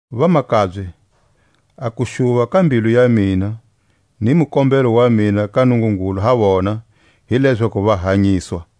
Vamakabye, a kuxuva ka mbilu ya mina, ni mukombelo wa mina ka Nungungulu ha vona, hi lezaku va hanyiswa.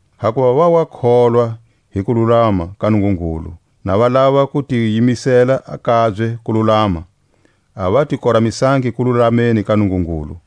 Hakuva va wa kohlwa hi kululama ka Nungungulu, na va lava ku ti yimisela a kabye kululama, a va ti koramisangi kululameni ka Nungungulu.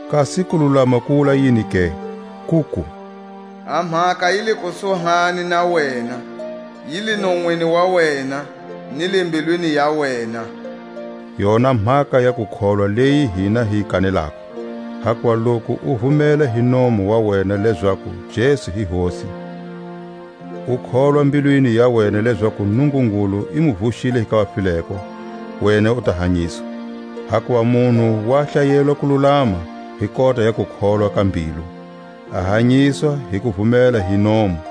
Kasi kululama ku wula yini ke? Kuku: A mhaka yi le kusuhani na wena, yi le nonwini wa wena, ni le mbilwini ya wena: yona mhaka ya kukholwa leyi hina hi yi kanelako. Hakuva loku u vumela hi nomu wa wena lezaku Jesu i Hosi, u kholwa mbilwini ya wena lezaku Nungungulu i mu vuxile hi ka vafileko, wena u ta hanyiswa. Hakuva munhu wa hlayelwa kululama hi kota ya kukholwa ka mbilu, a hanyiswa hi kuvumela hi nomu.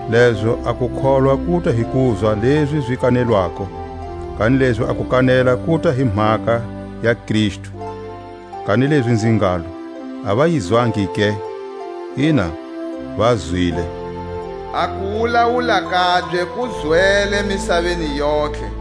Lezo a kukholwa kuta hi kuzwa lezi zi kanelwako, kanilezi a kukanela kuta hi mhaka ya Kristu. Kanilezi nzi ngalo: A va yi zwangi ke? Ina, va zwile. A kuwulawula kabye ku zwele misaveni yontlhe,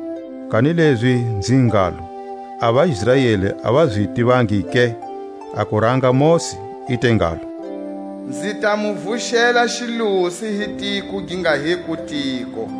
Kanilezi nzi ngalo: A vaIsraeli a va zi tivangi ke? A kuranga Mosi i te ngalo: Nzi ta mu vuxela xiluse hi tiko gi nga hiko tiko,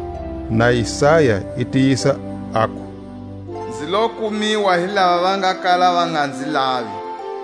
Na Isaya i tiyisa aku: Nzi lo kumiwa hi lava va nga kala va nga nzi lavi;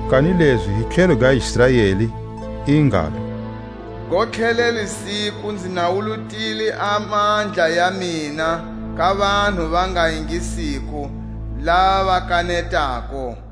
Kanilezi hi tlhelo ga Israeli i ngalo: Gontlhelele siku nzi nawulutile a mandla ya mina ka vanhu va nga ingisiko, lava va kanetako;